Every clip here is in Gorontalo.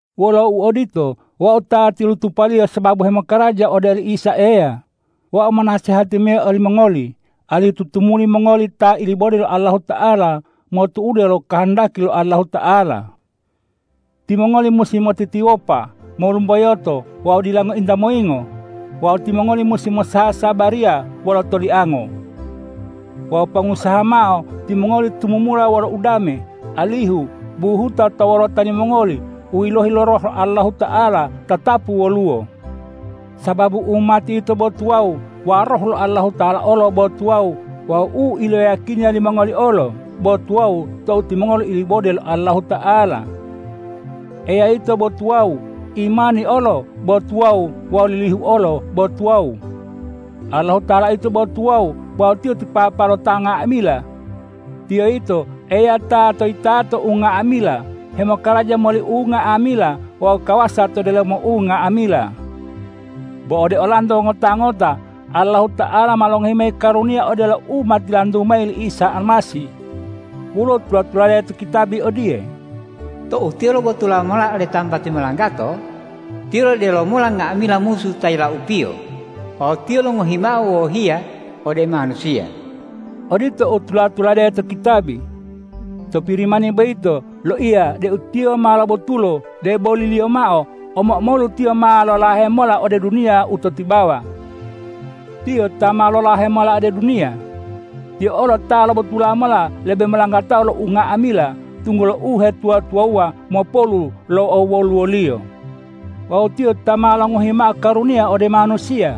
Wolo uodito, wau ta tilutupaliyo sababu hemokaraja ode li Isa Eya, wau monasehati mayi olimongoli alihu tutumuli mongoli ta ilibode lo Allahuta'ala motu'ude lo kohondaki lo Allahuta'ala. Timongoli musi motitiwopa, molumboyoto wawu dila ngointa moyingo. Wawu timongoli musi mosasabariya wolo toliango. Wawu pongusaha mao timongoli tumumula wolo udame, alihu buhuta to wolota limongoli u yilohi lo Roh lo Allahuta'ala tatapu woluwo. Sababu umati yito bo tuwawu wawu Roh lo Allahuta'ala olo bo tuwawu wawu u iloyiyakiniya limongoli olo bo tuwawu tou timongoli ilibode lo Allahuta'ala. Eya yito bo tuwawu, imani olo bo tuwawu wawu lilihu olo bo tuwawu. Allahuta'ala yito bo tuwawu wawu Tiyo ti Papa lo ta nga'amila. Tiyo yito Eya ta to yitato unga'amila, hemokaraja moli unga'amila wawu kawasa to delomo unga'amila. Bo ode olanto ngota-ngota Allahuta'ala ma longohi mayi karuniya odelo u ma tilantu mayi li Isa Almasih. Woluwo tula-tulade to kitabi odiye,”Tou Tiyo lobotula mola ode tambati molanggato, Tiyo lodelo mola nga'amila musu ta yilaupiyo wawu Tiyo longohi mao wohiya ode manusiya.” Odito u tula-tulade to kitabi. To Pirimani boyito loiya deu Tiyo ma lobotulo, deboliliyo mao omo-omolu Tiyo ma lolahe mola ode duniya u to tibawa. Tiyo ta ma lolahe mola ode duniya. Tiyo olo ta ma lobotula mola lebe molanggatao lo unga'amila, tunggulo uhetuwa-tuwawuwa mopolu lo owoluwo-Liyo. Wawu Tiyo ta ma longohi mao karuniya ode manusiya,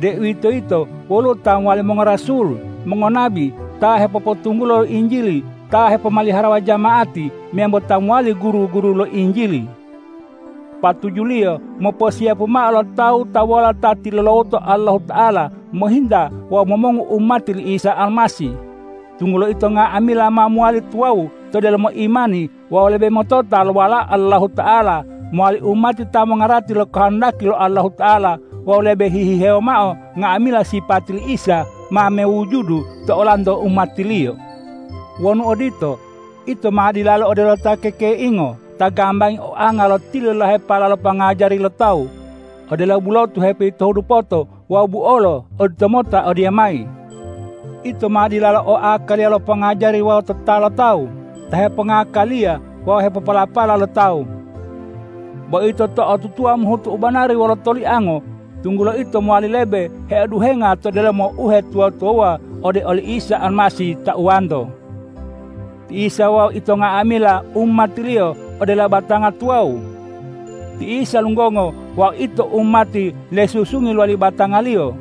deuwitoyito woluwo ta mowali mongorasul, mongonabi, ta hepopotunggula lo Injili, ta hepomaliharawa jama'ati meyambo ta mowali guru-guru lo Injili. Patujuliyo moposiyapu mao lo tawu-tawuwala ta tilulawoto Allahuta'ala mohinta wawu momongu umati li Isa Almasih, tunggulo ito nga'amila ma mowali tuwawu to delomo imani wawu lebe motota lo Walao Allahuta'ala, mowali umati ta mongarati lo kohondaki lo Allahuta'ala wawu lebe hihihewo mao nga'amila sipati li Isa ma mewujudu to olanto umati-Liyo. Wonu odito, ito ma dilalo odelo ta kekeingo ta gambangi oanga lo tililahepala lo pongajari lo tawu, odelo bulotu hepoyitohu dupota wawu buolo oditomota odiyamayi. Ito ma dilalo o akaliya lo pongajari wawu tota lo tawu ta hepongakaliya wawu hepopolapala lo tawu. Bo ito to'otutuwa mohutu u banari wolo toliango, tunggulo ito mowali lebe heoduhenga to delomo uhetuwa-tuwawuwa ode oli Isa Almasih tauwanto. Ti Isa wawu ito nga'amila umati-Liyo odelo batanga tuwawu. Ti Isa lunggongo wawu ito umati lesusungi lowali batanga-Liyo.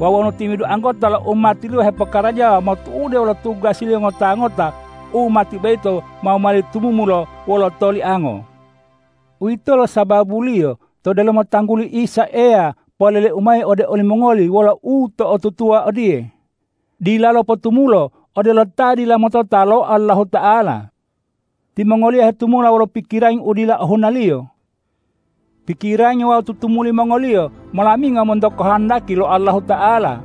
Wawu wonu timi'idu anggota lo umati-Liyo hepokarajawa motu'ude wolo tugasiliyo ngota-ngota, umati boyito ma mowali tumumulo wolo toliango. Uwitolo sababuliyo to delomo tangguli Isa Eya poleleu mayi ode olimongoli wolo uto'otutuwa odiye: Dilalo potumulo odelo ta dila motota lo Allahuta'ala. Timongoliyo hetumula wolo pikirangi u dila ohunaliyo. Pikirangi wawu tutumuli mongoliyo molamingo monto kohondaki lo Allahuta'ala,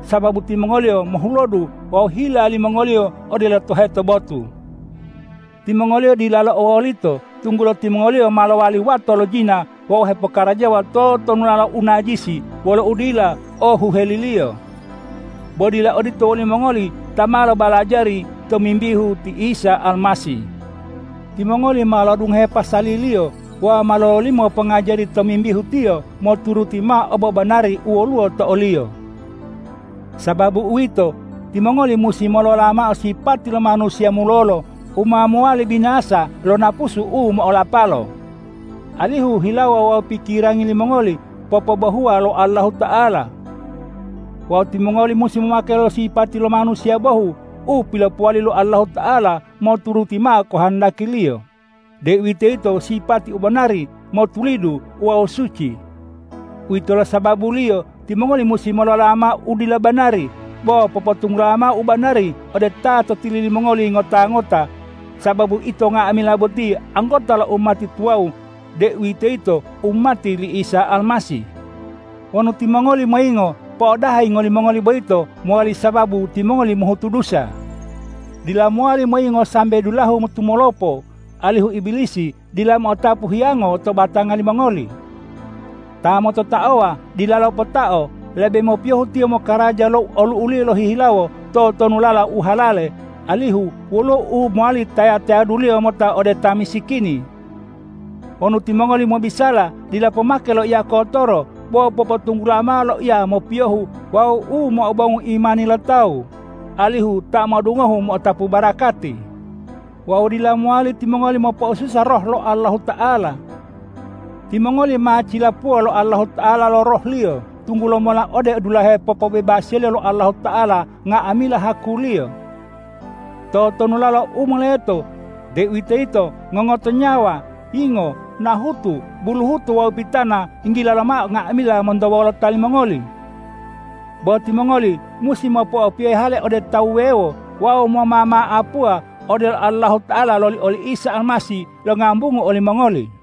sababu timongoliyo mohulodu wawu hila limongoliyo odelo toheto botu. Timongoliyo dilalo o wolito, tunggulo timongoliyo ma lowali wato lo jina wawu hepokarajawa totonulala u najisi wolo udila o huheliliyo. Bo dila odito wolimongoli ta ma lobalajari tomimbihu ti Isa Almasih. Timongoli ma lo'odungohe pasali-Liyo wawu ma lololimo pongajari tomimbihu Tiyo moturuti mao obobanari u woluwo to o-Liyo. Sababu uwito, timongoli musi molola mao sipati lo manusiya mulolo u ma mowali binasa lo napusu u mo'olapalo, alihu hilawo wawu pikirangi limongoli popobohuwa lo Allahuta'ala. Wawu timongoli musi momake lo sipati lo manusiya bohu u pilopowali lo Allahuta'ala moturuti mao kohondaki-Liyo, deuwitoyito sipati u banari, motulidu wawu suci. Uwitolo sababuliyo timongoli musi molola mao u dila banari, bo popotunggula mao u banari ode ta to tili limongoli ngota-ngota, sababu ito nga'amila botiye anggota lo umati tuwawu, deuwitoyito umati li Isa Almasih. Wonu timongoli moyingo, po'odaha yingo limongoli boyito mowali sababu timongoli mohutu dusa. Dila mowali moyingo sambe dulahu tumolopo, alihu Ibilisi dila mo'otapu hiyango to batanga limongoli. Ta mototaowa dilalo potao; lebe mopiyohu tiyo mokaraja lo olu'uliyo lohihilawo totonulala u halale, alihu woluwo u mowali taya-tayaduliyo mota ode ta misikini. Wonu timongoli mobisala, dila pomake loiya kotoro, bo popotunggula mao loiya mopiyohu wawu u mo'obongu imani lo tawu, alihu ta mo'odungohu mo'otapu barakati. Wawu dila mowali timongoli mopo'osusa Roh lo Allahuta'ala. Timongoli ma cilapuwa lo Allahuta'ala lo Roh-Liyo tunggula mola ode dulahe popobebasiya lo Allahuta'ala nga'amila haku-Liyo. Totonulala u moleto, deuwitoyito ngongoto nyawa, yingo, nahutu, buluhuto wawu pitana yinggila lomao nga'amila monto wolota limongoli. Bo timongoli musi mopo'opiyohe hale ode tawu wuwewo wawu momama'apuwa odelo Allahuta'ala loli oli Isa Almasih longambungu olimongoli.